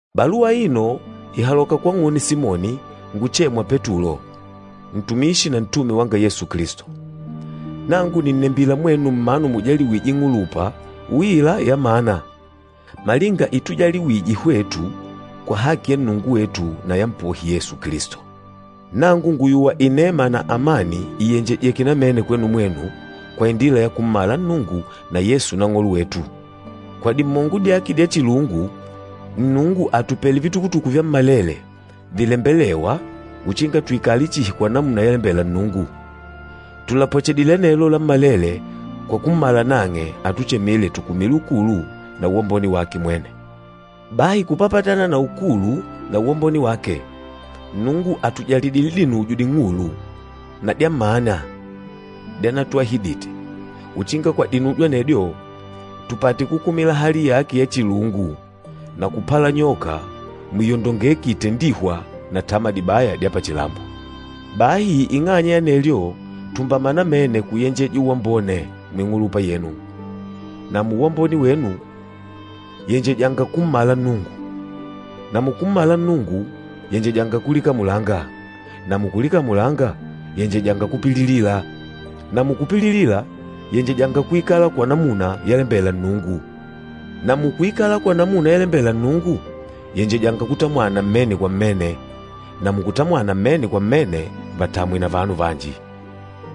Baluwa aino ìhaloka kwang'une Simoni nguchêmwa Petulo, ntumishi na ntume wanga Yesu Kilisto. Nangu nìnnembila mwenu mmanu mujaliwîje ing'ulupa uila yamana malinga itujaliwije hwetu kwa haki ya Nnungu wetu na ya Mpohi Yesu Kilisto. Nangu ngùyuwa inema na amani ìyenjejeke namene kwenu mwenu kwa indila ya kummala Nnungu na Yesu Nang'olo wetu. Kwa dimongo dyake dya chilungu, Nnungu àtupele vitukutuku vyammalele vilembelêwa uchinga tuikale chihi kwa namuna yalembela Nnungu. Tùlapwechedile anelo lammalele kwa kummala nang'e atuchemîle tukumile ukulu na uwambone wake mwene. Bahi kupapatana na ukulu na uwambone wake, Nnungu àtujalidile dinujo ding'ulu na dyamana dyanatuahidite, uchinga kwa dinujo anedyo tupate kukumila hali yake ya chilungu na kupalanyoka muiyondongeki itendîhwa na tama dibaya dya pachilambo. Bahi ing'anya ya anelyo, tumbama namene kuyenjeja uwambone muing'ulupa yenu, na muuwambone wenu, yenjejanga kummala Nnungu, na mukummala Nnungu, yenjejanga kulikamulanga, na mukulikamulanga, yenjejanga kupililila, na mukupililila, yenjejanga kuikala kwa namuna yalembela Nnungu, na mukuikala kwa namuna yalembela Nnungu, yenjejanga kutamwana mmene kwa mmene, na mukutamwana mmene kwa mmene, vatamwe na vanu vanji.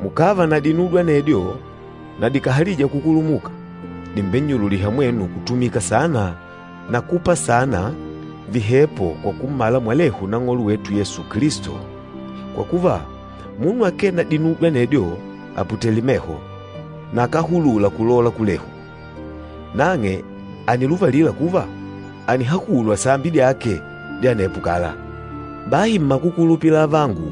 Mukàva na dinudyo anedyo na dikàhalija kukulumuka, dìmbennyululiha mwenu kutumika saana na kupa saana vihepo kwa kummala mwalehu Nang'olo wetu Yesu Kilisto Kwa kuva, munu akee na dinudyo anedyo, àputele meho, na akáhulula kulola kulehu. Nang'e àniluvalila kuva ànihahulwa sambi dyake dya anepo kala. Bahi mmakukulupila avangu,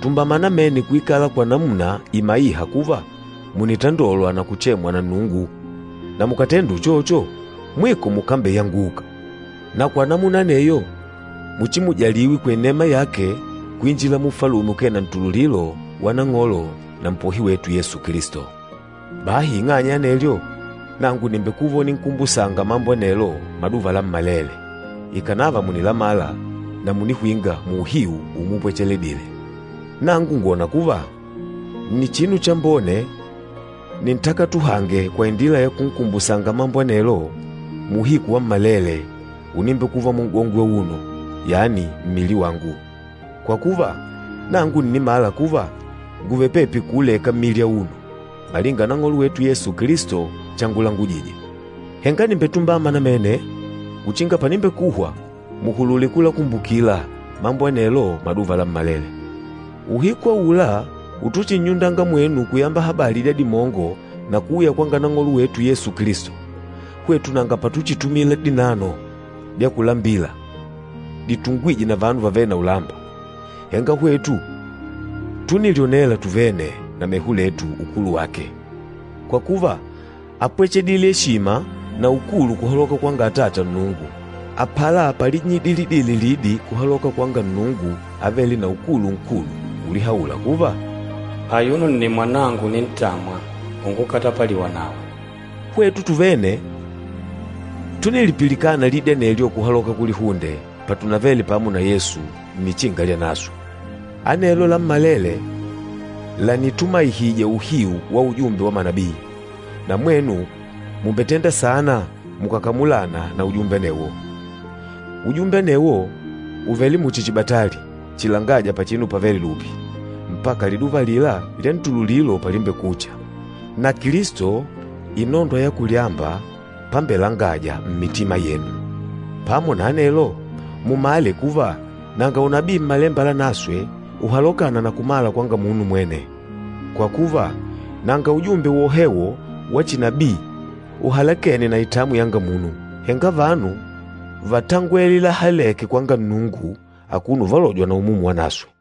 tumbama namene kuikala kwa namuna imaîha kuva mùnitandolwa na kuchemwa na Nnungu. Na mukàtenda uchocho, mwiko mukambeyanguka. Na kwa namuna aneyo muchimujaliwe kwa inema yake kuinjila mu Ufalume ukee na ntululilo wa Nang'olo na Mpohi wetu Yesu Kilisto. Bahi ing'anya ya anelyo, nangu nìmbekuva uninkumbusanga mambo anelo maduva lammalele, ikànava mùnilamala na mùnihwinga muuhiu umupwechedile. Nangu ngwòna kuva, nni chinu chambone nintakatuhange kwa indila ya kunkumbusanga mambo anelo muuhiku wammalele unimbekuva mun'gongwe auno, yani mmili wangu. Kwa kuva, nangu ǹnimala kuva ngùvele pepi kuuleka mmili auno, malinga Nang'olo wetu Yesu Kilisto changulangujije. Henga nìmbetumbama namene uchinga panimbekuhwa muhulule kulakumbukila mambo anelo maduva lammalele. Uhiku aula utuchinnyundanga mwenu kuyamba habali dya dimongo na kuuya kwanga Nang'olo wetu Yesu Kilisto, hwetu nanga patuchitumila dinano dya kulambila ditungwîje na vanu vavêle na ulamba, henga hwetu túnilyonela tuvene na meho letu, ukulu wake. Kwa kuva, ápwechedile eshima na ukulu kuhaloka kwanga Atata Nnungu, apala palinnyidilidile lidi kuhaloka kwanga Nnungu avêle na ukulu nkulu, ulihaula kuva, “Ayuno nni Mwanangu unintamwa, ungukatapaliwa nawe!” Hwetu tuvene túnilipilikana lidi anelyo kuhaloka kulihunde patunavele pamo na Yesu nnichinga lyanaswe. Anelo lammalele lànitumaihija uhiu wa ujumbe wa manabii. Na mwenu mùmbetenda saana mukàkamulana na ujumbe anewo. Ujumbe anewo ùvele muchi chibatali chilangâja pachinu pavêle lupi, mpaka liduva alila lyantululilo palimbekucha, na Kilisto, inondwa ya kulyamba pambelangaja mmitima yenu. Pamo na anelo, mumale kuva nanga unabii Mmalemba Lanaswe uhalokâna na kumala kwanga munu mwene. Kwa kuva, nanga ujumbe wohewo wa chinabii uhalekêne na itamwi yanga munu, henga vanu vátangwele lahalêke kwanga Nnungu akuno uvalojwa na Umumu Wanaswe.